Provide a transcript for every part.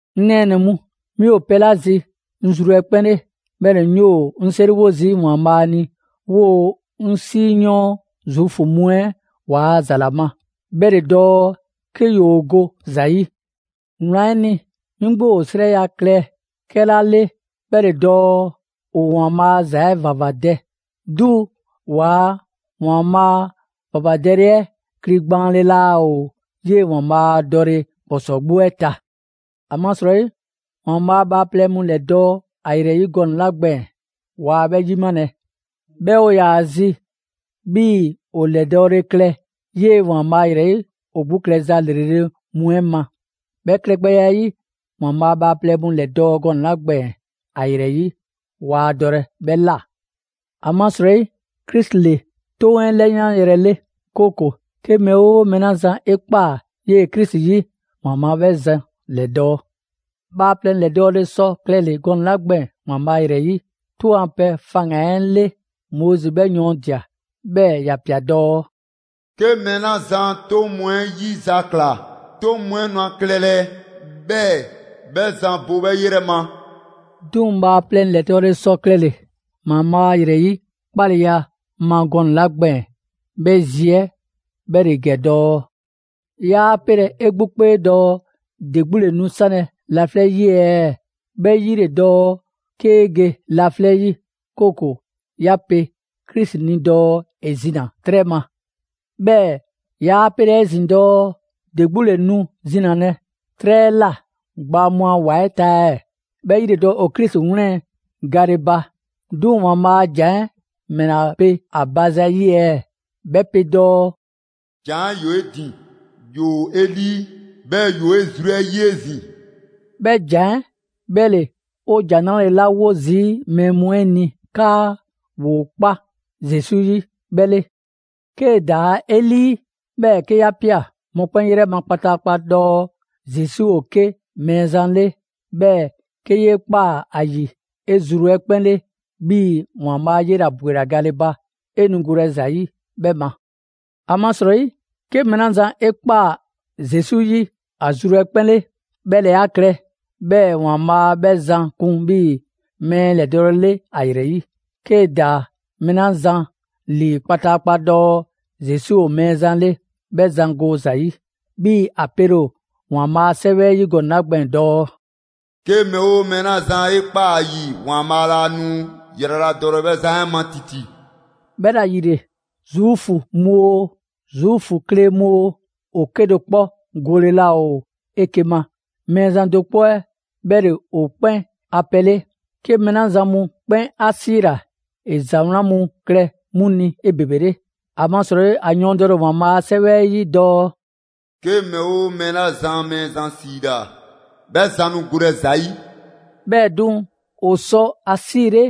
'Ŋ nɛɛnɛ‑ mu, 'mi ‑o pɛ 'la zi 'ŋ zru 'ɛ 'kpɛn 'le, 'bhɛɛ‑ 'ŋ 'yoo‑ 'ŋ 'seriwo zii' ‑Waanbhaa' ni 'woo‑ 'ŋ 'siyɔɔn Zuufu mu 'ɛ waa ‑za 'la ma, 'bhɛ ‑le dɔɔ 'ke ‑yoo go ‑za 'yi. Wlan 'ɛ ni, 'mi 'gbu ‑o 'srɛya‑ klɛ 'kɛla 'le 'bhɛ ‑le dɔɔ ‑o ‑Waanbhaa' a ‑za 'ɛ ‑vavadɛ, 'duŋ‑ ‑waa ‑Waanbhaa' ‑vavadɛle 'ɛ kligbaanle laa ‑o 'yee ‑Waanbhaa' dɔle ‑kpɔsɔɔ 'gbu 'ɛ ta. ‑Amasrɔyi, ‑Waanbhaa' bhaaplɛŋ mu ‑lɛdɔɔ' ‑a ‑yrɛ 'yi gɔnɛ‑ 'la gbɛɛn‑, waa 'bhɛ 'yimalɛ. 'Bhɛɛ‑ ‑o ‑yaa' zi 'bhii‑ ‑o ‑lɛdɔɔle klɛ 'yee ‑Waanbhaa' ‑yrɛ 'yi ‑o 'gbu klɛza ‑lrele' mu 'ɛ ma. 'Bhɛ klɛgbɛya 'ɛ 'yi, ‑Waanbhaa' bhaaplɛŋ mu ‑lɛdɔɔ' gɔnɛ‑ 'la gbɛɛn‑ ‑a ‑yrɛ 'yi, waa dɔlɛ 'bhɛ ꞊la. ‑Amasrɔyi, Krisi ‑le 'toŋ 'ɛ 'lɛyanyrɛ 'le, 'kooko‑ 'ke mɛɛ 'oo mɛɛ 'la zan 'e ꞊kpaa 'yee‑ Krisi 'yi, ‑Waanbhaa' 'bhɛ zan ‑lɛdɔɔ'. Bhaaplɛŋ ‑lɛdɔɔle sɔ klɛle‑ gɔnɛ‑ 'la gbɛɛn‑ ‑Waanbhaa' ‑yrɛ 'yi 'toŋ a pɛ faŋgan‑ 'ɛ 'le, Moizi 'bhɛ yɔɔndia꞊, 'bhɛɛ‑ ‑ya ꞊pia dɔɔ: «'Ke mɛɛ 'la zan 'toŋ mu 'ɛ 'yizakla, 'toŋ mu 'ɛ nu ‑a klɛlɛ 'bhɛɛ‑ 'bhɛ zan bo 'bhɛ 'yrɛ ma.» 'Duŋ‑ bhaaplɛŋ ‑lɛdɔɔle sɔ klɛle‑ ‑Waanbhaa' ‑yrɛ 'yi 'kpaleya ma gɔnɛ‑ 'la gbɛɛn‑, 'bhɛ zi 'ɛ 'bhɛ ‑le ‑gɛ dɔɔ: «'Yaa 'pelɛ‑ 'e 'gbu 'kpee dɔɔ: ‑De 'gbu 'le nu 'sanlɛ‑ laflɛ' 'yi ɛɛ?» ('Bhɛ 'yi ‑le dɔɔ 'kee ge laflɛ' 'yi, 'kooko‑ 'ya pe Krisi ni dɔɔ ‑e zina‑ 'trɛ ma). 'Bhɛɛ‑ 'yaa 'pelɛ‑ 'ezin‑ dɔɔ: «‑De 'gbu ‑le nu zinalɛ 'trɛ 'ɛ ꞊la gbaa mu a ‑wa 'ɛ ta ɛɛ?» ('Bhɛ 'yi ‑le dɔɔ ‑o Krisi 'wlɛn‑ gale ba). 'Duŋ‑ ‑Waanbhaa' a ‑jan 'ɛ ‑mɛla pe ‑a ba zayi' ɛɛ? 'Bhɛ pe dɔɔ: «‑Jan 'ɛ ‑yoo 'e ‑din, ‑yoo 'e 'lii, 'bhɛɛ‑ ‑yoo 'e zru 'ɛ 'yi 'ezin‑.» 'Bhɛ ‑jan 'ɛ 'bhɛ ‑le 'o ‑Jan 'Nrale‑ 'la 'wo zii' mɛɛ mu 'ɛ ni 'kaa ‑woo 'kpa Zesu 'yi 'bhɛ 'le. 'Kee‑ ‑daa 'e 'lii, 'bhɛɛ‑ 'ke 'ya ꞊pia mɔkpɛn' 'yrɛ ma kpataakpa dɔɔ Zesu ‑o 'ke Mɛɛzan 'le, 'bhɛɛ‑ 'ke 'yee ꞊kpaa ‑a ‑yi 'e zru 'ɛ 'kpɛn 'le 'bhii‑ ‑Waanbhaa' 'yela‑ ‑bwela gale ba, 'e nu golɛ ‑za 'yi 'bhɛ ma. ‑Amasrɔyi 'ke mɛɛ 'la zan 'e ꞊kpaa Zesu 'yi ‑a zru 'ɛ 'kpɛn 'le, 'bhɛ ‑le 'a klɛ 'bhɛɛ‑ ‑Waanbhaa' 'bhɛ zan kun 'bhii‑ mɛɛ ‑lɛdɔɔle 'le ‑a ‑yrɛ 'yi; 'kee‑ ‑daa mɛɛ 'la zan ‑lii kpataakpa dɔɔ Zesu ‑o Mɛɛzan 'le, 'bhɛ zan go ‑za 'yi. 'Bhii‑ ‑a pele ‑o ‑Waanbhaa' a 'Sɛwɛ 'ɛ 'yi gɔnɛ‑ 'la gbɛɛn‑ dɔɔ: «'Ke mɛɛ 'oo mɛɛ 'la zan 'e ꞊kpaa ‑a ‑yi, ‑Waanbhaa' laa nu ‑yraladɔlɛ 'bhɛ zan 'ɛ ma ‑titi.» 'Bhɛla‑ ‑yile, Zuufu mu oo, Zuufu kle mu oo, ‑o 'kedo‑ 'kpɔ gole laa ‑o 'eke‑ ma. Mɛɛzan do 'kpɔ 'ɛ 'bhɛ ‑le ‑o 'kpɛn a pɛ 'le; 'ke mɛɛ 'la zan mu 'kpɛn 'a 'siila‑, ‑e ‑za 'wlan mu klɛ 'mu ni 'ebebele. ‑Amasrɔyi ‑a yɔɔndɛle ‑o ‑Waanbhaa' a 'Sɛwɛ 'ɛ 'yi dɔɔ: «'Ke mɛɛ 'oo mɛɛ 'la zan Mɛɛzan ‑siila, 'bhɛ zan nu golɛ ‑za 'yi.» 'Bhɛɛ‑ 'duŋ‑, ‑o sɔ ‑a 'siile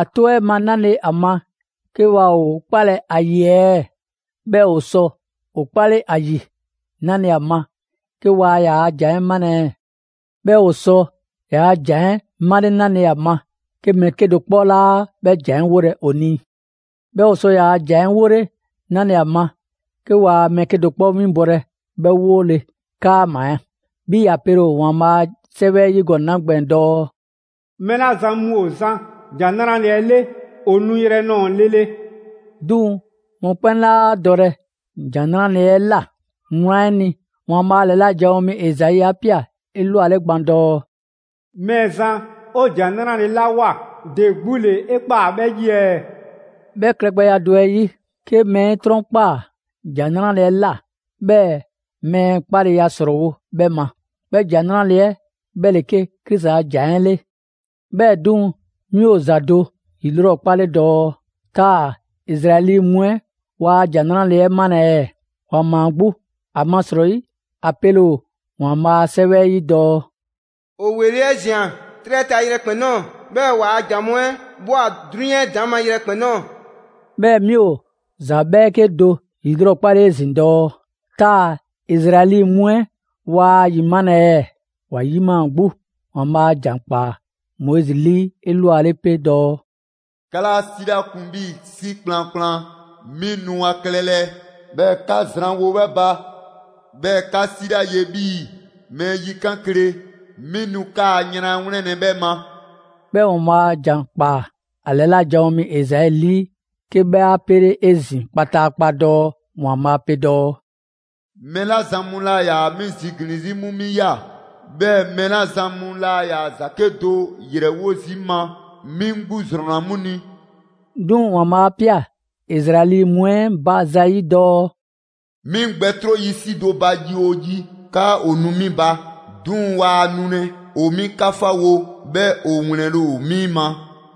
‑a 'tɔ 'ɛ ma 'nale‑ ‑a ma 'ke waa ‑o 'kpalɛ‑ ‑a ‑yi ɛɛ? 'Bhɛɛ‑ ‑o sɔ ‑o 'kpale ‑a ‑yi 'nale‑ ‑a ma 'ke waa ‑yaa' ‑jan 'ɛ 'malɛ‑ ɛɛ? 'Bhɛɛ‑ ‑o sɔ ‑yaa' ‑jan 'ɛ 'male 'nale‑ ‑a ma 'ke mɛɛ 'kedo‑ 'kpɔ 'laa 'bhɛ ‑jan 'ɛ 'wolɛ‑ ‑o ni? 'Bhɛɛ‑ ‑o sɔ ‑yaa' ‑jan 'ɛ 'wole 'nale‑ ‑a ma 'ke waa mɛɛ 'kedo‑ 'kpɔ 'winbɔlɛ 'bhɛ 'wole‑ 'kaama‑? 'Bhii‑ ‑a pele‑ ‑o ‑Waanbhaa' a 'Sɛwɛ 'ɛ 'yi gɔnɛ‑ 'la gbɛɛn‑ dɔɔ: «Mɛɛ 'la zan mu ‑o zan ‑Jan 'Nrale‑ 'ɛ 'le, ‑o nuyrɛ nɔɔ‑ lele!» 'Duŋ‑ mɔkpɛn' 'laa dɔlɛ ‑Jan 'Nrale‑ 'ɛ ꞊la. Wlan 'ɛ ni, ‑Waanbhaa' ‑lɛla' janwo mi Ezai 'a ꞊pia elwale gban dɔɔ: «Mɛɛzan, 'o ‑Jan 'Nrale‑ 'la ꞊woa, ‑de 'gbu ‑le 'e ꞊kpaa 'bhɛ 'yi ɛɛ?» 'Bhɛ klɛgbɛya 'ɛ 'yi, 'ke mɛɛ 'e 'trɔnkpaa ‑Jan 'Nrale‑ 'ɛ ꞊la, 'bhɛɛ‑ mɛɛ 'kpaleya ‑srɔɔwo' 'bhɛ ma. 'Bhɛ ‑Jan 'Nrale‑ 'ɛ 'bhɛ ‑le 'ke Krisi a ‑jan 'ɛ 'le. 'Bhɛɛ‑ 'duŋ‑, 'mi ‑o ‑za do ‑yilrɔkpale dɔɔ: Taa‑ Izraɛli mu 'ɛ waa ‑Jan 'Nrale‑ 'ɛ 'malɛ‑ ɛɛ? ‑Wa ‑maa 'gbu! ‑Amasrɔyi ‑a pele ‑o ‑Waanbhaa' a 'Sɛwɛ 'ɛ 'yi dɔɔ: «‑O ‑weli' 'ɛ ꞊zian 'trɛ 'ɛ ta yrɛkpɛn‑ ꞊nɔɔ. 'Bhɛɛ‑ waa ‑jan mu 'ɛ ꞊bhwa 'drunyan 'ɛ ‑daŋ' ma yrɛkpɛn‑ ꞊nɔɔ.» 'Bhɛɛ‑ 'mi ‑o ‑za 'bhɛɛke do 'yilrɔkpale 'ezin‑ dɔɔ: Taa‑ Izraɛli mu 'ɛ waa ‑a ‑yimalɛ ɛɛ? ‑Wa ‑yimaa 'gbu! ‑Waanbhaa' ‑jan ꞊kpaa Moizi 'lii 'elwale 'pe dɔɔ: «'Ka 'laa 'si 'la kun 'bhii‑ 'si kplankplan, 'mi nu ‑a klɛlɛ 'bhɛɛ‑ 'ka zranwo 'bhɛ ba. 'Bhɛɛ‑ 'ka 'si la 'ye 'bhii‑ mɛɛ yikan' kle, 'mi nu 'kaa‑ yran 'ɛ 'wlɛnlɛ‑ 'bhɛ ma.» 'Bhɛɛ‑ ‑Waanbhaa' ‑jan ꞊kpaa ‑a ‑lɛla' janwo mi Ezai 'lii 'ke 'bhɛ 'a 'pele 'ezin‑ kpataakpa dɔɔ ‑Waanbhaa' pe dɔɔ: «Mɛɛ 'la zan mu laa ‑yaa 'mi ziglin‑ 'zi, 'mu 'mi ꞊ya. 'Bhɛɛ‑ mɛɛ 'la zan mu laa ‑yaa ‑za 'kedo‑ ‑yrɛwo' zii' 'ŋ ma, 'mi 'ŋ 'gbu ‑zrɔnna 'mu ni.» 'Duŋ‑ ‑Waanbhaa' 'a ꞊pia Izraɛli mu 'ɛ ba zayi' dɔɔ: «'Mi 'ŋ gbɛ 'tro zii' 'si do ba 'yi 'oo yi 'kaa ‑o nu 'mi ba; 'duŋ‑ waa nulɛ. ‑O 'mi 'kafawo, 'bhɛɛ‑ ‑o ‑wlɛnle' ‑o 'mi ma.»